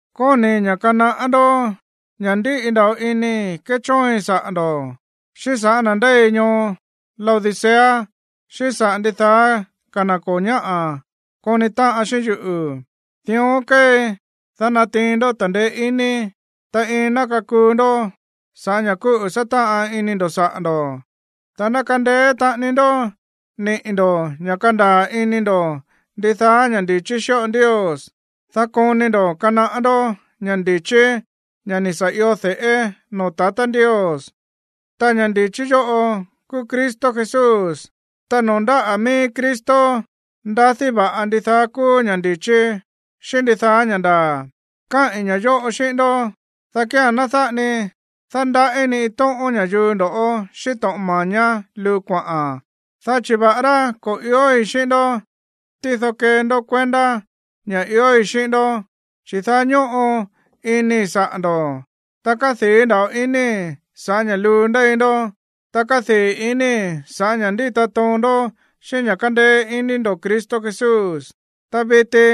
Kóni̱i̱ ña̱ kanaꞌá ndó ña̱ ndíꞌi nda̱ꞌo inii̱ kéchóoin saꞌa̱ ndo̱, xíꞌín sa̱ꞌá na̱ ndéi ñoo Laodicea xíꞌín saꞌa̱ ndidaá ka̱ na̱ ko̱ ñáꞌa̱ koni táꞌan xíꞌín yuꞌu̱. Dión kéei, dá natiin ndó ta̱ndeé iní, ta iin ná kakuu ndó sa̱ꞌá ña̱ kúꞌu̱ sátáꞌan ini ndo̱ saꞌa̱ ndo̱, ta ná kandeé taꞌani ndó niꞌi̱ ndo̱ ña̱ kandaa̱ ini ndo̱ ndidaá ña̱ ndi̱chí xíꞌo Ndios, dá koni ndo̱ kanaꞌá ndó ña̱ ndi̱chí, ña̱ ni̱ sa̱ io de̱ꞌé noo̱ tatá Ndios, ta ña̱ ndi̱chí yóꞌo kúú Cristo Jesús. Ta noo̱ ndáꞌa̱ mií Cristo ndadí va̱ꞌa ndidaá kúú ña̱ ndi̱chí xíꞌín ndidaá ña̱ ndaa̱. Káꞌi̱n ña̱ yóꞌo xíꞌín ndó, dá kía̱n ná dáꞌa ni dándaꞌí ni iin tóꞌón ña̱yuu ndo̱ꞌó xíꞌín to̱ꞌon mañá luu kuaꞌa̱n, dá chi̱ va̱ꞌará ko̱ iói̱ xíꞌín ndó, tído kee ndó kuendá ña̱ iói̱ xíꞌín ndó, chi̱ daá ñóꞌo inii̱ saꞌa̱ ndo̱, ta kádii̱ nda̱ꞌo inii̱ sa̱ꞌá ña̱ luu ndéi ndó, ta kádii̱ inii̱ sa̱ꞌá ña̱ ndíta toon ndó xíꞌín ña̱ kándéé iní ndo̱ Cristo Jesús. Ta viti,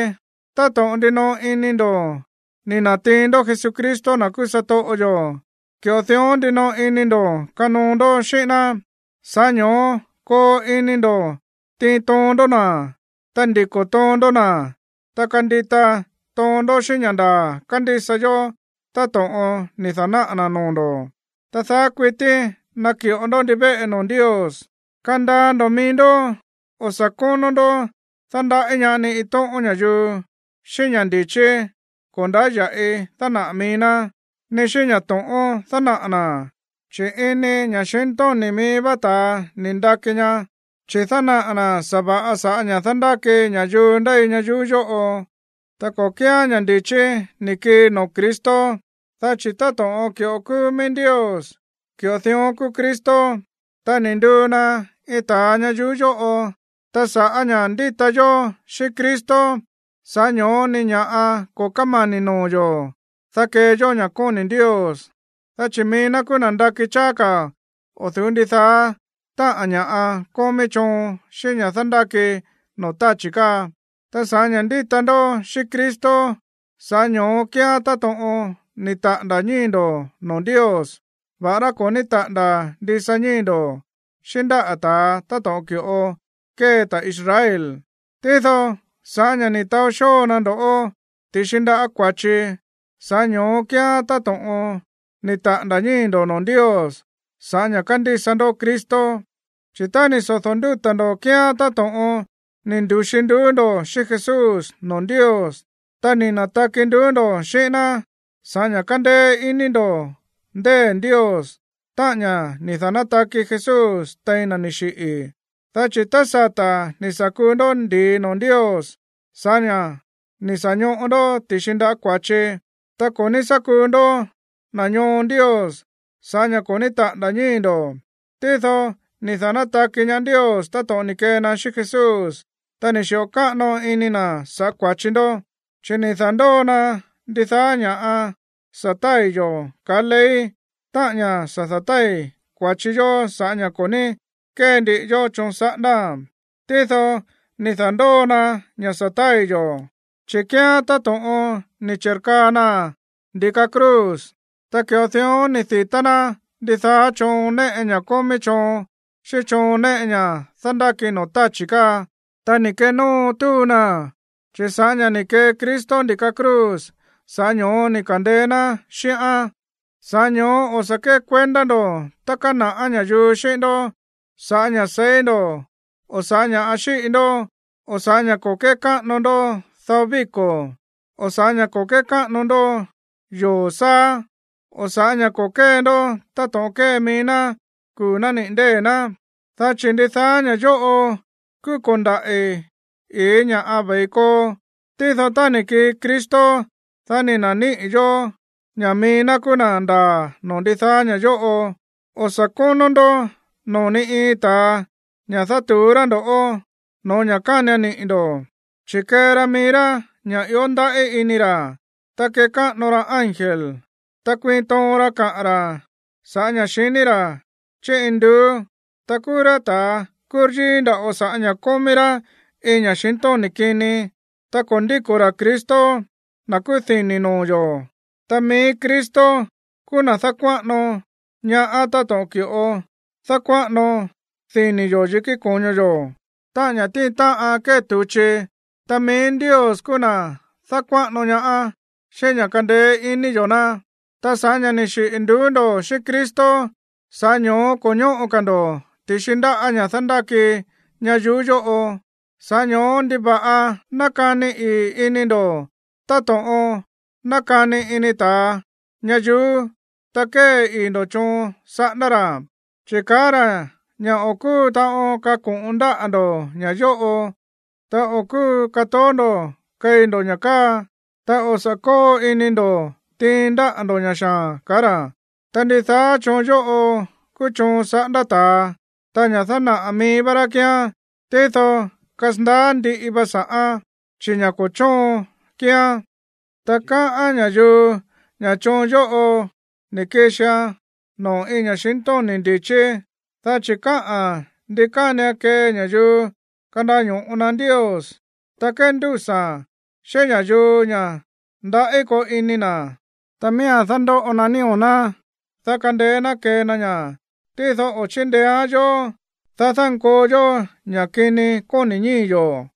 táto̱ꞌon ndinoꞌo ini ndo̱ ni̱ na̱tiin ndó Jesucristo, na̱ kúú satoꞌo yo̱, ki̱ꞌo dión ndinoꞌo ini ndo̱ kanoo ndó xíꞌín ná. Sa̱ꞌá ño̱ó koo ini ndo̱ tiin toon ndó na̱, ta ndiko̱ toon ndó na̱, ta kandita toon ndó xíꞌín ña̱ ndaa̱ kándísa yó táto̱ꞌon ni̱ da̱náꞌa̱ na̱ noo̱ ndo̱, ta daá kuití naki̱ꞌo ndó ndivéꞌe noo̱ Ndios. Kandaa ndo̱ mií ndó, o̱ sa̱ kónó ndó dándaꞌí ñaá ni iin tóꞌón ña̱yuu xíꞌín ña̱ ndi̱chí ko̱ ndáya̱ꞌi dánaꞌa̱ mií ná, ni xíꞌín ña̱ to̱ꞌón dánaꞌa̱ na̱, chi̱ ini ña̱xintóni̱ mií vá ta̱a ni̱ ndaki ña, chi̱ dánaꞌa̱ na̱ sa̱va̱ꞌa sa̱ꞌá ña̱ dándáki ña̱yuu ndéi ñayuú yóꞌo, ta ko̱ kíán ña̱ ndi̱chí ni̱ kii noo̱ Cristo. Dá chi̱ táto̱ꞌon ki̱ꞌo kúú mií Ndios, ki̱ꞌo dión kúú Cristo, ta ni̱ nduu na iin ta̱a ñayuú yóꞌo. Ta sa̱ꞌá ña̱ ndíta yó xíꞌín Cristo, sa̱ꞌá ño̱ó ni ña̱ꞌa ko̱ kómani̱ noo̱ yo̱, dá kee yó ña̱ kóni̱ Ndios, dá chi̱ mií ná kúú na̱ ndakí cháá ka̱ o̱ du̱ú ndidaá táꞌa̱n ña̱ kómí choon xíꞌín ña̱ dándáki noo̱ táchi̱ káa. Ta sa̱ꞌá ña̱ ndíta ndó xíꞌín Cristo, sa̱ꞌá ño̱ó kíán táto̱ꞌon ni̱ taꞌa̱nda̱ ñíi̱ ndo̱ noo̱ Ndios, va̱ꞌará ko̱ ní taꞌa̱nda̱ ndisa ñíi̱ ndo̱ xíꞌín ndáꞌa̱ ta̱a táto̱ꞌon ki̱ꞌo kée ta̱ Israel. Tído, sa̱ꞌá ña̱ ni̱ taó xóo na ndo̱ ti̱xi ndáꞌa̱ kua̱chi, sa̱ꞌá ño̱ó kíán táto̱ꞌon ni̱ taꞌa̱nda̱ ñíi̱ ndo̱ noo̱ Ndios sa̱ꞌá ña̱ kándísa ndó Cristo. Chi̱ tá ni̱ sodo̱ ndúta̱ ndo̱ kíán táto̱ꞌon ni̱ ndu̱xi nduú ndo̱ xíꞌín Jesús noo̱ Ndios. Ta ni̱ na̱taki nduú ndo̱ xíꞌín ná sa̱ꞌá ña̱ kándéé iní ndo̱ ndée̱ Ndios, táꞌa̱n ña̱ ni̱ da̱nátaki Jesús tein na̱ ni̱ xiꞌi̱. Dá chi̱ tá sata̱ ni̱ sa̱ kuu ndó ndi̱i noo̱ Ndios sa̱ꞌá ña̱ ni̱ sa̱ ñoꞌo ndó ti̱xi ndáꞌa̱ kua̱chi, ta ko̱ ní sá kuu ndó na̱ ñoo Ndios sa̱ꞌá ña̱ ko̱ ní taꞌa̱nda̱ ñíi̱ ndo̱. Tído ni̱ da̱nátaki ñaá Ndios táto̱ꞌon ni̱ kee na xíꞌín Jesús, ta ni̱ xi̱ꞌo káꞌano ini na̱ sa̱ꞌá kua̱chi ndó. Chi̱ ni̱ da̱ndóo na ndidaá ña̱ sa̱ tái̱ yo̱ kaá ley, táꞌa̱n ña̱ sa̱ da̱tái̱ kua̱chi yó sa̱ꞌá ña̱ ko̱ ní kée ndiꞌi yó choon saꞌándáa̱n. Tído ni̱ da̱ndóo na ña̱ sa̱ tái̱ yo̱, chi̱ kíán táto̱ꞌon ni̱ chi̱rkaa naa̱n ndi̱ka cruz. Ta ki̱ꞌo dión ni̱ di̱tá ná ndidaá choon néꞌe ña̱ kómí choon xíꞌín choon néꞌe ña̱ dándáki noo̱ táchi̱ káa, ta ni̱ kenóo túu naa̱n, chi̱ sa̱ꞌá ña̱ ni̱ kee Cristo ndi̱ka cruz, sa̱ꞌá ño̱ó ni̱ ka̱ndeé ná xíꞌán. Sa̱ꞌá ño̱ó o̱ sa̱ kékuendá ndo̱ tá kana̱ꞌá ña̱yuu xíꞌín ndó sa̱ꞌá ña̱ seí ndo̱, o sa̱ꞌá ña̱ xíꞌi ndó, o sa̱ꞌá ña̱ ko̱ kékáꞌano ndó dao víko̱, o sa̱ꞌá ña̱ ko̱ kékáꞌano ndó yoo̱ sáá o sa̱ꞌá ña̱ ko̱ kée ndó táto̱ꞌon kée mií ná kuu̱ nániꞌi̱ ndée̱ ná. Dá chi̱ ndidaá ña̱ yóꞌo kúú ko̱ndaꞌi̱ iin ña̱ꞌa ve̱i koo, tído tá ni̱ kii Cristo, dá ni̱ na̱níꞌi̱ yo̱ ña̱ mií ná kúú na̱ ndaa̱ noo̱ ndidaá ña̱ yóꞌo. O̱ sa̱ kónó ndó noo̱ ni iin ta̱a ña̱ dátu̱ú rá ndo̱ꞌó no̱ó ña̱ kánian niꞌi̱ ndo̱, chi̱ kée ra mií rá ña̱ ió ndaꞌí ini ra̱, ta kékáꞌano ra ángel, ta kuiin toon ra káꞌa̱n ra̱ sa̱ꞌá ña̱ xiní ra̱ chí induú. Ta kúú rá ta̱a kúryíí nda̱ꞌo sa̱ꞌá ña̱ kómí rá iin ña̱xintóni̱ kini. Ta ko̱ ndíko̱ ra̱ Cristo, na̱ kúú dini̱ noo̱ yo̱. Ta mií Cristo kúú na̱ dákuáꞌano ñaá táto̱ꞌon ki̱ꞌo dákuáꞌano dini̱ yo̱ yikí ko̱ño yo̱, táꞌa̱n ña̱ tíin táꞌan kée tu̱chi, ta mií Ndios kúú na̱ dákuáꞌano ñaá xíꞌín ña̱ kándéé iní yo̱ ná. Ta sa̱ꞌá ña̱ ni̱ xiꞌi̱ nduú ndo̱ xíꞌín Cristo, sa̱ꞌá ño̱ó ko̱ ñóꞌo ka̱ ndo̱ ti̱xi ndáꞌa̱ ña̱ dándáki ñayuú yóꞌo. Sa̱ꞌá ño̱ó, ¿ndiva̱ꞌa nákani ii̱ ini ndo̱ táto̱ꞌon nákani ini ta̱a ñayuú, ta kée ii̱ ndo̱ choon saꞌándá ra̱? Chi̱ kaá ra̱ ña̱ o̱ kúu taꞌon kako̱ꞌon ndáꞌa̱ ndo̱ ña̱ yóꞌo, ta o̱ kúu katoó ndo̱ keí ndo̱ ña̱ káa, ta o̱ sa̱ kóo ini ndo̱ tiin ndáꞌa̱ ndó ña̱ xaa̱n, kaá ra̱. Ta ndidaá choon yóꞌo kúú choon saꞌándá ta̱a, ta ña̱ dánaꞌa̱ mií vá rá kíán, tído kasandaá ndiꞌi va sa̱ꞌán, chi̱ ña̱ ko̱ chóon kíán. Ta káꞌán ña̱yuu ña̱ choon yóꞌo ni̱ kixian noo̱ iin ña̱xintóni̱ ndi̱chí, dá chi̱ káꞌa̱n ndi kánian kee ña̱yuu kandaño̱ꞌo na Ndios, ta kéndúsa̱a̱n xíꞌín ña̱yuu ña̱ ndaꞌí koo ini na̱, ta miía̱n dándóꞌo na nío̱ ná, dá kandeé ná kee na ña̱. Tído o̱ chíndeéán yó, dá dánkoo yó ña̱ kini kóni̱ ñíi̱ yo̱.